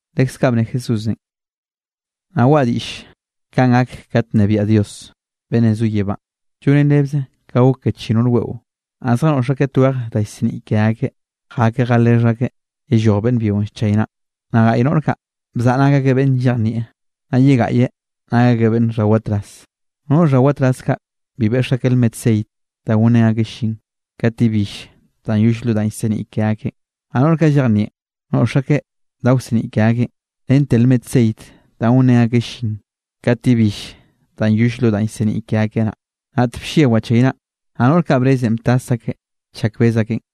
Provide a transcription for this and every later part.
Leskaꞌ bne Jesúsenꞌ: —Nnaꞌ waꞌa diꞌll kanꞌ gak kat nnebiaꞌ Dios, beꞌnnenꞌ zo yebánꞌ, llonen rebze kanꞌ gok ke chi noꞌr weꞌo. Naꞌ zjanoꞌx akeꞌ twej da llseniꞌ ke akeꞌ, jakeꞌ jalexh akeꞌ yelloj beꞌnn byionꞌ llchaynaꞌn. Naꞌ gaꞌy noꞌr kaꞌ bzaꞌa nak akeꞌ beꞌnn llejnieꞌ, naꞌ ye gaꞌye nak akeꞌ beꞌnn xhawatraz. Noꞌr xhawatraz kaꞌ bi beꞌx akeꞌ lmet ceit da gonrén akeꞌ llin, kat yebill danꞌ yoll lo danꞌ llseniꞌ ke akeꞌn. Naꞌ noꞌr kaꞌ llejnieꞌn, noꞌx akeꞌ da wseniꞌ ke akeꞌn, rente lmet ceit da gonrén akeꞌ llin, kat yebill danꞌ yoll lo danꞌ llseniꞌ ke akeꞌ naꞌ. Naꞌt blle wachaynaꞌn, naꞌ noꞌr kaꞌ brezenꞌ btas akeꞌ chak bez akeꞌn.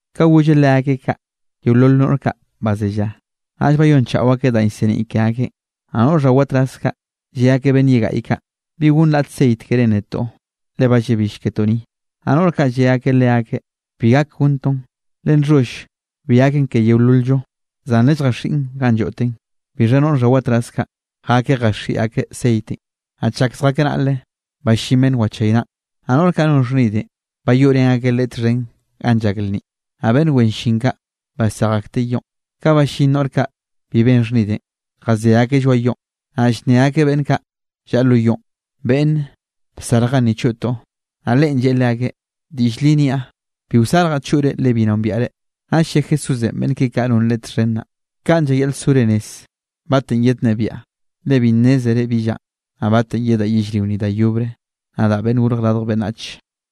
Ka golleꞌ leakeꞌ kaꞌ, yeolol noꞌr kaꞌ bazellaꞌ, naꞌll bayonchaꞌo akeꞌ danꞌ llseniꞌ ke akeꞌn. Naꞌ noꞌr xhawatraz kaꞌ, lle akeꞌ beꞌnn ye gaꞌy kaꞌ: “¿Bi gonn raꞌt ceit kerénꞌ netoꞌ? Le ba llabill ketoꞌ ni.” Naꞌ noꞌr kaꞌ lle akeꞌ leakeꞌ: “Bi gak gonntoꞌn, le nxholl bi gaken ke yeolol-llo. Zan lelljaxiꞌn ganꞌ lloꞌteꞌn.” Bixha noꞌr xhawatraz kaꞌ, jakeꞌ jaxiꞌi akeꞌ ceitenꞌ. Naꞌ chak zjakeꞌ naꞌle, ballín beꞌnn wachaynaꞌn, naꞌ noꞌr kaꞌ non xhnidenꞌ, bayoꞌrén akeꞌ leꞌe txhen ganꞌ llak lnninꞌ, naꞌ beꞌnn wen llin kaꞌ basej akteꞌ yoꞌn. Ka ballín noꞌr kaꞌ bi ben xhnidenꞌ, jazé akeꞌ lloaꞌ yoꞌn, naꞌ llnne akeꞌ beꞌnn kaꞌ llaꞌa lo yoꞌn: “¡Beꞌnne, bsarje ganni choꞌtoꞌ!” Naꞌ leꞌen lleꞌe leakeꞌ: “Diꞌll li niaꞌ, bi wsarjaꞌ choꞌre le bi nombiaꞌ reꞌ.” Naꞌll lle Jesúsenꞌ beꞌnn keꞌe kaꞌ non Leꞌe txhen naꞌ: —Kanꞌ llayaꞌl sore rez batenꞌ yednnebiaꞌ, le bi nnézere bi llanꞌ, naꞌ batenꞌ yedaꞌ yellrio ni da yobre, nadaꞌ Beꞌnn Gorj Radj Beꞌnnach.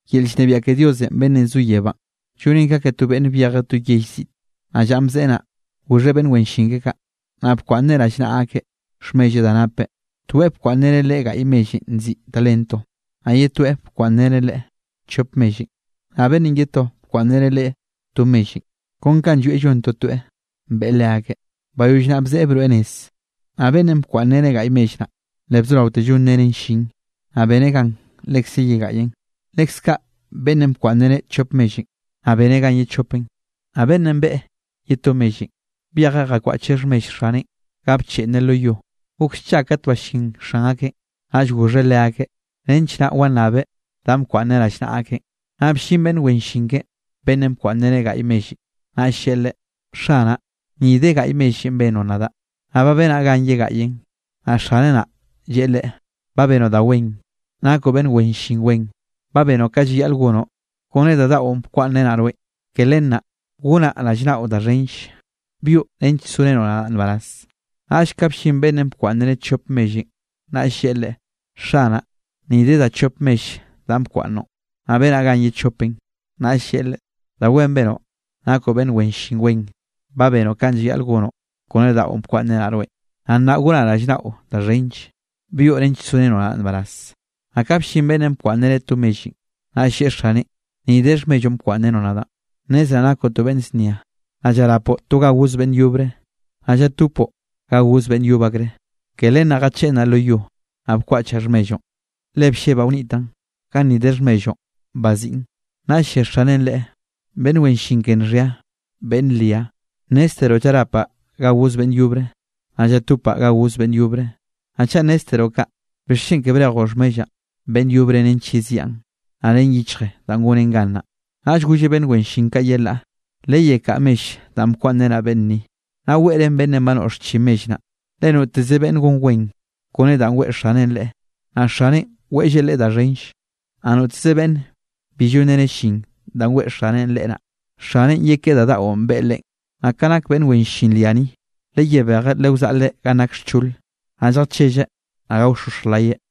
’Yel llnebiaꞌ ke Diosenꞌ beꞌnnenꞌ zo yebánꞌ, llonen ka ke to beꞌnne byejeꞌ to yell ziꞌte. Naꞌ llanꞌ bzeꞌe naꞌ, goxheꞌ beꞌnn wen llin keꞌe kaꞌ, naꞌ bkwaꞌnneꞌ rallnaꞌa akeꞌ xhmelleꞌ da napeꞌ. Toeꞌ bkwaꞌnnreneꞌ leꞌe gaꞌy mellenꞌ nziꞌi talento. Naꞌ ye toeꞌ bkwaꞌnnreneꞌ leꞌe chop mellenꞌ. Naꞌ beꞌnnenꞌ ye to bkwaꞌnnreneꞌ leꞌe to mellenꞌ. Kon kanꞌ llwieꞌ llon totoeꞌ beꞌe leakeꞌ. Bayoll naꞌ bzeꞌe broeꞌ nez. Naꞌ beꞌnnenꞌ bkwaꞌnnreneꞌ gaꞌy mell naꞌ, le bzoraoteꞌ llonreneꞌn llin, naꞌ beneꞌ gan lekze ye gaꞌyen. Lekze kaꞌ beꞌnnenꞌ bkwaꞌnnreneꞌ chop mellenꞌ, naꞌ beneꞌn gan ye chopen. Naꞌ beꞌnnenꞌ beꞌe ye to mellenꞌ, byejeꞌ jakwaꞌcheꞌ xhmell xaneꞌn ga bcheꞌnneꞌ lo yo. ’Gok scha kat ballín xan akeꞌn, naꞌll goxheꞌ leakeꞌ, nench naꞌ wannabeꞌ danꞌ bkwaꞌnneꞌ rallnaꞌa akeꞌn. Naꞌ bllin beꞌnn wen llin keꞌe beꞌnnenꞌ bkwaꞌnnreneꞌ gaꞌy mellenꞌ, naꞌll lleꞌe leꞌe: “Xanaꞌ, ni de gaꞌy mellenꞌ bennoꞌ nadaꞌ, naꞌ ba benaꞌ gan ye gaꞌyen.” Naꞌ xaneꞌ naꞌ, lleꞌe leꞌe: “Ba benoꞌ da wen. Nakoꞌ beꞌnn wen llin wen, ba benoꞌ ka llayaꞌl gonoꞌ kone da daꞌon bkwaꞌnnrenaꞌ rweꞌn, ke len naꞌ, gonaꞌ rallnaꞌo da xhenlle. Byoꞌ nench sorenoꞌ nadaꞌ nbaraz.” Naꞌll ka bllin beꞌnnenꞌ bkwaꞌnnreneꞌ chop mellenꞌ, naꞌll lleꞌe leꞌe: “Xanaꞌ, ni de da chop mell danꞌ bkwaꞌnnoꞌn, naꞌ benaꞌ gan ye chopen.” Naꞌll lleꞌe leꞌe: “Da wen benoꞌ nakoꞌ beꞌnn wen llin wen. Ba benoꞌ ka llayaꞌl gonoꞌ kone da daꞌon bkwaꞌnnrenaꞌ rweꞌn. Naꞌ nnaꞌ gonaꞌ rallnaꞌo da xhenlle, byoꞌ nench sorenoꞌ nadaꞌ nbaraz.” Naꞌ ka bllin beꞌnnenꞌ bkwaꞌnnreneꞌ to mellenꞌ, naꞌll lleꞌe xaneꞌn: “Ni de xhmelloꞌn bkwaꞌnnrenoꞌ nadaꞌn. Nnezraꞌ nakoꞌ to beꞌnn znia, naꞌ llarapoꞌ to ga goz beꞌnn yobre, naꞌ llatopoꞌ ga goz beꞌnn yob akre. Ke len naꞌ, jacheꞌnnaꞌ lo yo, naꞌ bkwaꞌchaꞌ xhmelloꞌn, le bllebaꞌ wnitaꞌn. Ganni de xhmelloꞌn, baziꞌn.” Naꞌll lle xaneꞌn leꞌe: “¡Beꞌnn wen llin ke nxhia, beꞌnn ria! Nnézteroꞌ llarapaꞌ ga goz beꞌnn yobre, naꞌ llatopaꞌ ga goz beꞌnn yobre. Naꞌ chaꞌ nnézteroꞌ kaꞌ, ¿bixchen ke brejoꞌ xhmellaꞌn beꞌnn yobre, nench yeziaꞌn, naꞌ ren yichje da gonen gan?” Naꞌll golleꞌ beꞌnn wen llin kaꞌ yelaꞌ: “Leyekaꞌa mell danꞌ bkwaꞌnnrenaꞌ beꞌnn ni, naꞌ weꞌrén beꞌnnenꞌ ba noꞌx chi mell naꞌ. Le noteze beꞌnn gon wen kone danꞌ weꞌe xaneꞌn leꞌe, naꞌ xaneꞌn weꞌlleꞌ leꞌe da xhenlle. Naꞌ noteze beꞌnne bi llonreneꞌ llin danꞌ weꞌe xaneꞌn leꞌe naꞌ, xaneꞌn yekeꞌe da daꞌon beꞌe leꞌen. Naꞌ ka nak beꞌnn wen llin ria ni, leyebejeꞌ lewzaꞌleꞌ ganꞌ nak xchole, naꞌ lljachelleꞌ naꞌ gaoxoxj layeꞌ.”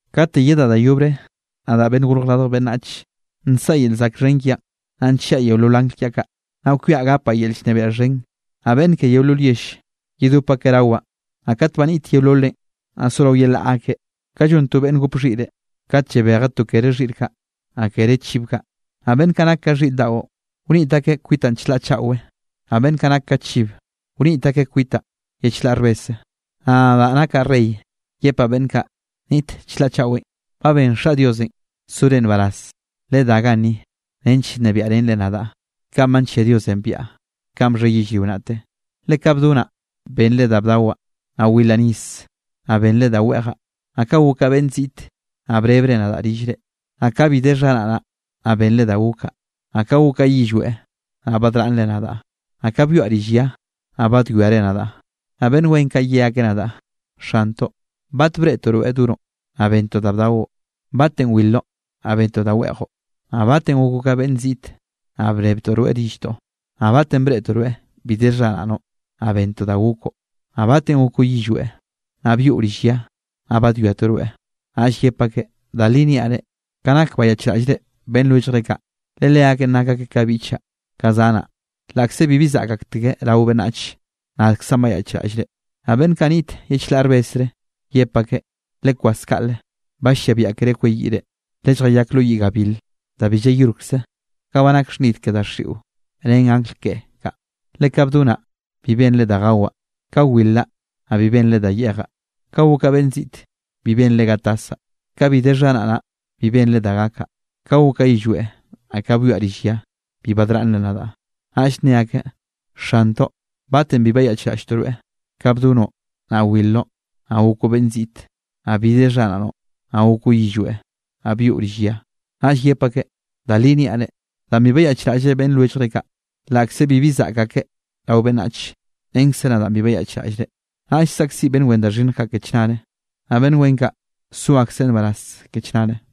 ’Katenꞌ yedaꞌ da yobre nadaꞌn Beꞌnnenꞌ Gorj Radj Beꞌnnach, nsaꞌa yel zaꞌk xhen kiaꞌn, naꞌ nchiaꞌ yeolol angl kiaꞌ kaꞌ, naꞌ kwiaꞌ gapaꞌ yel llnebiaꞌ xhen. Naꞌ beꞌnn ke yeolol yell, yedop akeꞌ rawaꞌn. Naꞌ kat ba niꞌt yeololeꞌn, naꞌ sorao yelaꞌ akeꞌ, ka llon to beꞌnn gop xhiꞌre, kat llabejeꞌ to kere xhiꞌr kaꞌ, naꞌ kere chib kaꞌ. Naꞌ beꞌnn kaꞌ nak ka xhiꞌr daꞌo, wniꞌt akeꞌ kwitaꞌn chlaꞌ chaꞌwe, naꞌ beꞌnn kaꞌ nak ka chiv, wniꞌt akeꞌ kwitaꞌn ye chlaꞌ rbese. Naꞌ nadaꞌ nakaꞌ rey yepaꞌ beꞌnn kaꞌ niꞌt chlaꞌ chaꞌwenꞌ: “Ba ben Xaꞌ Diosenꞌ sore nbaraz, ledá ganni nench nnebiaꞌrenre nadaꞌ, kanꞌ ba nllia Diosenꞌ biaꞌa, kanꞌ bxhe yellrio naꞌte. Le ka bdonaꞌ, bennre da bdawaꞌ; naꞌ wilraꞌ nis, naꞌ bennre da weꞌjaꞌ; naꞌ ka gokaꞌ beꞌnn ziꞌte, naꞌ brebre nadaꞌ rillre. Naꞌ ka bi de xharaꞌnaꞌ, naꞌ bennre da gokaꞌ; naꞌ ka gokaꞌ yillweꞌ, naꞌ badraꞌnnre nadaꞌ; naꞌ ka byoaꞌ rill ya, naꞌ badwiare nadaꞌ.” Naꞌ beꞌnn wen kaꞌ ye akeꞌ nadaꞌ: “Xantoꞌ, ¿bat breꞌtoꞌ rweꞌ donoꞌ, naꞌ benntoꞌ da bdaoꞌ? Naꞌ ¿batenꞌ wilroꞌ naꞌ benntoꞌ da weꞌjoꞌ? Naꞌ ¿batenꞌ gokoꞌ ka beꞌnn ziꞌte naꞌ brebtoꞌ rweꞌ rilltoꞌ? Naꞌ ¿batenꞌ breꞌtoꞌ rweꞌ bi de xharaꞌnoꞌ naꞌ benntoꞌ da gokoꞌ? Naꞌ ¿batenꞌ gokoꞌ yillweꞌ naꞌ byoꞌ rill ya, naꞌ badwiatoꞌ rweꞌ?” Naꞌll yep akeꞌ: “Da li niaꞌ re, ka nak bayaꞌchraꞌllre beꞌnn lwelljre kaꞌ, le leakeꞌn nak akeꞌ ka biꞌchaꞌ, ka zanaꞌ, laꞌkze bibi zaꞌk aktekeꞌ rao beꞌnnach, nadkzaꞌn bayaꞌchraꞌllre.” ’Naꞌ beꞌnn kaꞌ niꞌt ye chlaꞌ rbesre, yep akeꞌ: “Lekwas kaꞌle, ba llia biaꞌa keré kweyiꞌre, lelljayak lo yiꞌ gabil, danꞌ bi llayolkze ganꞌ ba nak xhnid ke daxiꞌon ren angl ke kaꞌ. Le ka bdonaꞌ, bi bennre da gawaꞌ, ka wilraꞌ, naꞌ bi bennre da yeꞌjaꞌ. Ka gokaꞌ beꞌnn ziꞌte, bi bennre ga tasaꞌ; ka bi de xharaꞌnaꞌ, bi bennre da gakaꞌ; ka gokaꞌ yillweꞌ, naꞌ ka byoaꞌ rill ya, bi badraꞌnnre nadaꞌ.” Naꞌll nne akeꞌ: “Xantoꞌ, ¿batenꞌ bi bayaꞌchraꞌlltoꞌ rweꞌ, ka bdonoꞌ, naꞌ wilroꞌ, naꞌ gokoꞌ beꞌnn ziꞌt, naꞌ bi de xharaꞌnoꞌ naꞌ gokoꞌ yillweꞌ, naꞌ byoꞌ rill ya?” Naꞌll yep akeꞌ: “Da li niaꞌ reꞌ, danꞌ bi bayaꞌchraꞌllre beꞌnn lwelljre kaꞌ, laꞌkze bibi zaꞌk akeꞌ rao beꞌnnach, renkze nadaꞌn bi bayaꞌchraꞌllre.” Naꞌll saꞌkziꞌ beꞌnn wen da xhinnj kaꞌ ke chnare, naꞌ beꞌnn wen kaꞌ so akseꞌ nbaraz ke chnare.